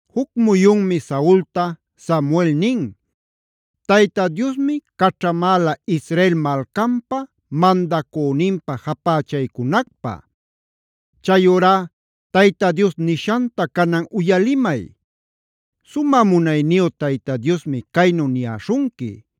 Juc muyunmi Saulta Samuel nin: “Tayta Diosmi caćhamäla Israel malcanpa mandacüninpä japächaycunacpä.a Chayurá Tayta Dios nishanta canan uyalimay. Sumä munayniyu Tayta Diosmi caynu niyäśhunqui: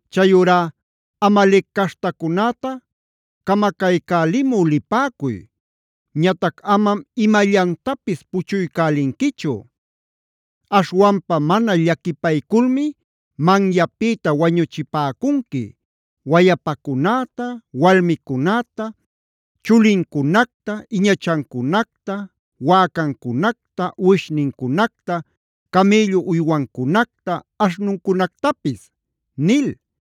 Chayurá Amalec caśhtacunäta camacaycälimü lipäcuy. Ñatac amam imallantapis puchuycälinquichu. Aśhwanpa mana llaquipayculmi manyapïta wañuchipäcunqui wayapacunäta, walmicunäta, chulincunacta, iñachancunacta, wäcancunacta, uwishnincunacta, camïllu uywancunacta, aśhnuncunactapis’” nil.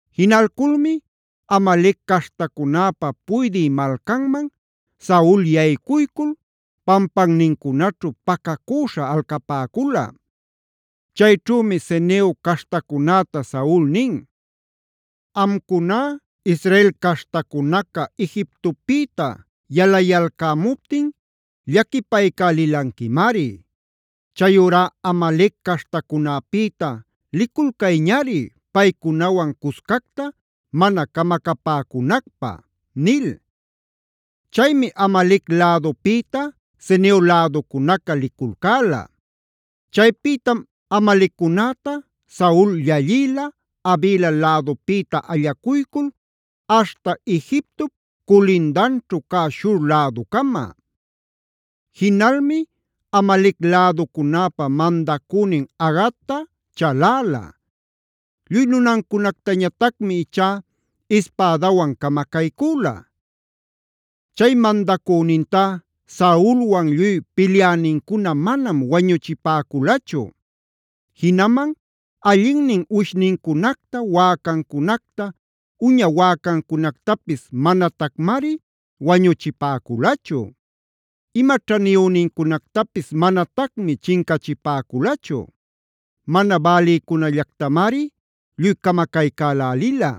Jinalculmi Amalec caśhtacunäpa puydï malcanman Saul yaycuycul pampannincunaćhu pacacüśha alcapäcula. Chayćhümi Ceneo caśhtacunäta Saul nin: “Amcuná Israel caśhtacunaca Egiptopïta yalayalcämuptin llaquipaycälilanquimari. Chayurá Amalec caśhtacunäpïta liculcayñari paycunawan cuscacta mana camacapäcunacpä” nil. Chaymi Amalec lädupïta Ceneo läducunaca liculcäla. Chaypïtam Amaleccunäta Saul llallïla Havila lädupïta allacuycul aśhta Egiptop culindanćhu cä Shur läducama. Jinalmi Amalec läducunäpa mandacünin Agagta chaläla. Lluy nunancunactañatacmi ichá ispädawan camacaycüla. Chay mandacünintá Saulwan lluy pilyänincuna manam wañuchipäculachu. Jinaman allinnin uwishnincunacta, wäcancunacta, uña wäcancunactapis manatacmari wañuchipäculachu. Ima ćhaniyünincunactapis manatacmi chincachipäculachu. Mana bälicunällactamari lluy camacaycälälila.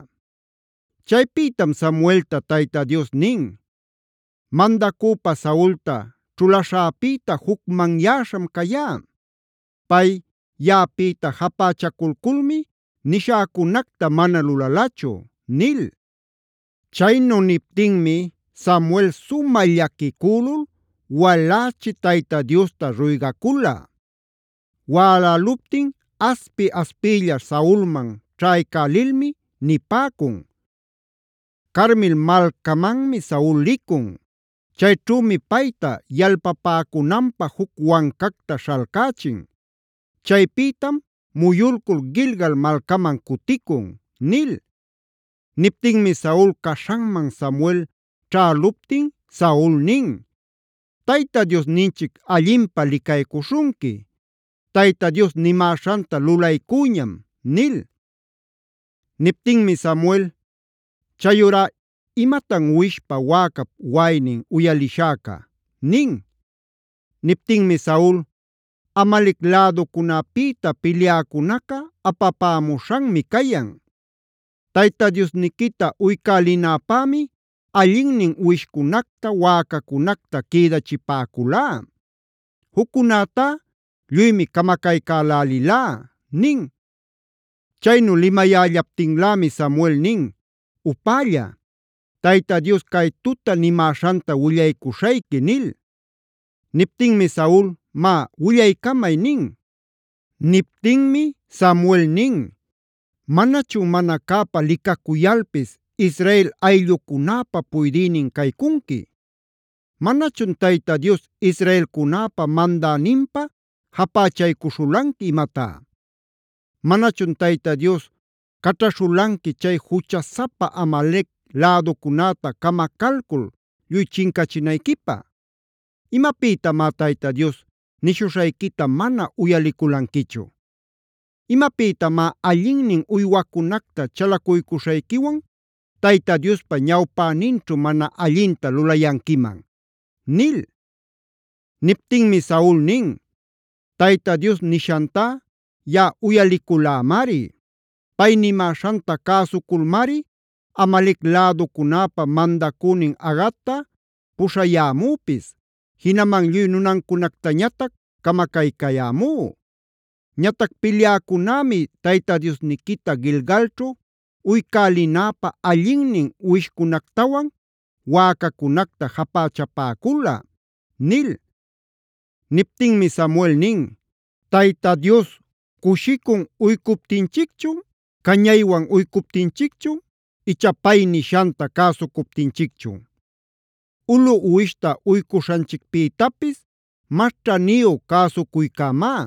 Chaypïtam Samuelta Tayta Dios nin: “Mandacüpä Saulta ćhulaśhäpïta jucmanyäśham cayá. Pay yaꞌapïta japächaculculmi nishäcunacta mana lulalachu” nil. Chaynu niptinmi Samuel sumä llaquicülul walächi Tayta Diosta ruygacula. Wäläluptin aspi-aspiylla Saulman ćhaycälilmi nipäcun: “Carmel malcamanmi Saul licun. Chayćhümi payta yalpapäcunanpä juc wancacta śhalcächin. Chaypïtam muyulcul Gilgal malcaman cuticun” nil. Niptinmi Saul caśhanman Samuel ćhäluptin Saul nin: “Tayta Diosninchic allinpä licaycuśhunqui. Tayta Dios nimäśhanta lulaycüñam” nil. Niptinmi Samuel: “¿Chayurá imatan uwishpa, wäcap waꞌaynin uyalishäca?” nin. Niptinmi Saul: “Amalec läducunäpïta pilyäcunaca apapämuśhanmi cayan. Tayta Diosniquita uycälälinäpämi allinnin uwishcunacta, wäcacunacta quïdachipäculá. Juccunätá lluymi camacaycälälilá” nin. Chaynu limayällaptinlämi Samuel nin: “¡Upälla! Tayta Dios cay tuta nimäśhanta willaycuśhayqui” nil. Niptinmi Saul: “Má, willaycamay” nin. Niptinmi Samuel nin: “¿Manachun mana cäpa licacuyalpis Israel ayllucunäpa puydïnin caycunqui? ¿¡Manachun Tayta Dios israelcunäpa mandäninpä japächaycuśhulanqui imatá!? ¿Manachun Tayta Dios caćhaśhulanqui chay juchasapa Amalec läducunäta camacalcul lluy chincachinayquipä? ¿Imapïtamá Tayta Dios nishuśhayquita mana uyaliculanquichu? ¿Imapïtamá allinnin uywacunacta chalacuycuśhayquiwan Tayta Diospa ñawpäninćhu mana allinta lulayanquiman?” nil. Niptinmi Saul nin: “Tayta Dios nishantá yaꞌa uyaliculämari. Pay nimäśhanta cäsuculmari Amalec läducunäpa mandacünin Agagta puśhayämüpis, jinaman lluy nunancunactañatac camacaycayämú. Ñatac pilyäcunämi Tayta Diosniquita Gilgalćhu uycälinäpä allinnin uwishcunactawan wäcacunacta japächapäcula” nil. Niptinmi Samuel nin: “¿Tayta Dios cushicun uycuptinchicchun, cañaywan uycuptinchicchun icha pay nishanta cäsucuptinchicchun? Ulu uwishta uycuśhanchicpïtapis mas ćhaniyu cäsucuycämá;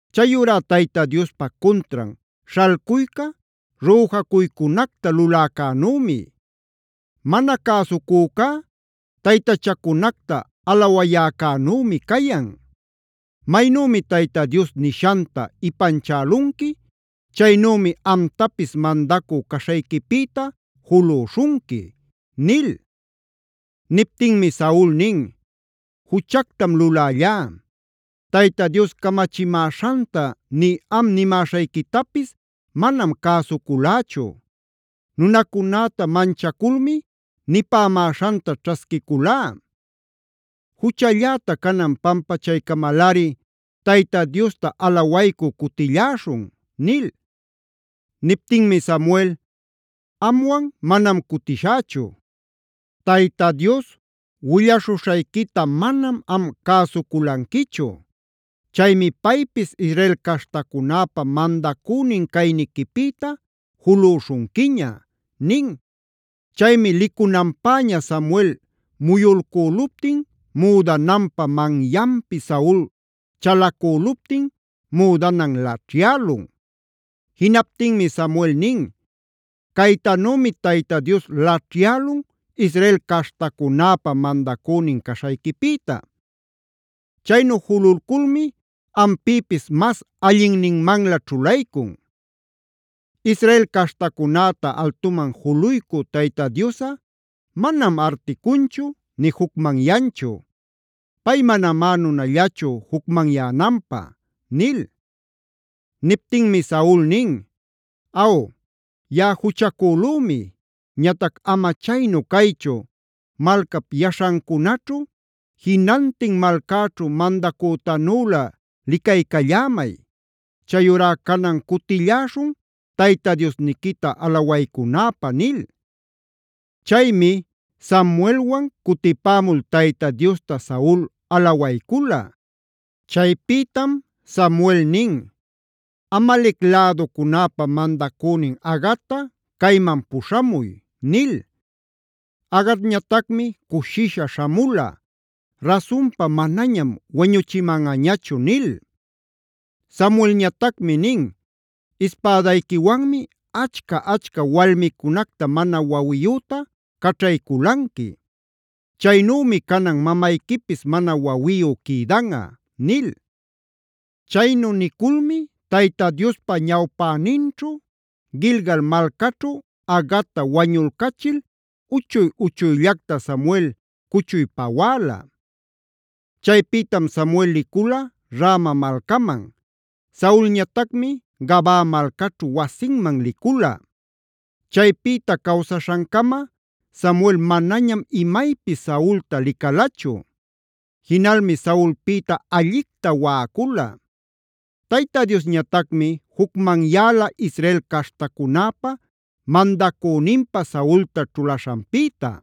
Chayurá Tayta Diospa cuntran śhalcuyca rüjacuycunacta luläcänümi. Mana cäsucücá taytachacunacta alawayäcänümi cayan. Maynümi Tayta Dios nishanta ipanchälunqui; chaynümi amtapis mandacü caśhayquipïta julüśhunqui” nil. Niptinmi Saul nin: “Juchactam lulällá. Tayta Dios camachimäśhanta nï am nimäśhayquitapis manam cäsuculächu. Nunacunäta manchaculmi nipämäśhanta ćhasquiculá. Juchalläta canan pampachaycamalꞌari Tayta Diosta alawaycü cutilläśhun” nil. Niptinmi Samuel: “Amwan manam cutishächu. Tayta Dios willaśhuśhayquita manam am cäsuculanquichu. Chaymi paypis Israel caśhtacunäpa mandacünin cayniquipïta julüśhunquiña” nin. Chaymi licunanpäña Samuel muyulcüluptin müdananpä manyanpi Saul chalacüluptin müdanan laćhyälun. Jinaptinmi Samuel nin: “Caytanümi Tayta Dios laćhyälun Israel caśhtacunäpa mandacünin caśhayquipïta. Chaynu jululculmi ampïpis mas allinninmanlä ćhulaycun. Israel caśhtacunäta altuman juluycü Tayta Diosꞌa manam articunchu, nï jucmanyanchu. Pay manamá nunallachu jucmanyänanpä” nil. Niptinmi Saul nin: “Aw, yaꞌa juchacülümi. Ñatac ama chaynu caychu, malcap yaśhancunaćhu, jinantin malcäćhu mandacütanülä licaycallämay. Chayurá canan cutilläśhun Tayta Diosniquita alawaycunäpä” nil. Chaymi Samuelwan cutipämul Tayta Diosta Saul alawaycula. Chaypïtam Samuel nin: “Amalec läducunäpa mandacünin Agagta cayman puśhamuy” nil. Agagñatacmi cushisha śhamula: “Rasunpa, manañam wañuchimanꞌañachu” nil. Samuelñatacmi nin: “Ispädayquiwanmi achca-achca walmicunacta mana wawiyüta caćhayculanqui. Chaynümi canan mamayquipis mana wawiyu quïdanꞌa” nil. Chaynu niculmi Tayta Diospa ñawpäninćhu Gilgal malcaćhu Agagta wañulcachil uchuy-uchuyllacta Samuel cuchuy pawäla. Chaypïtam Samuel licula Rama malcaman. Saulñatacmi Gabaa malcaćhu wasinman licula. Chaypïta cawsaśhancama Samuel manañam imaypis Saulta licalachu. Jinalmi Saulpïta allicta waꞌacula. Tayta Diosñatacmi jucmanyäla Israel caśhtacunäpa mandacüninpä Saulta ćhulaśhanpïta.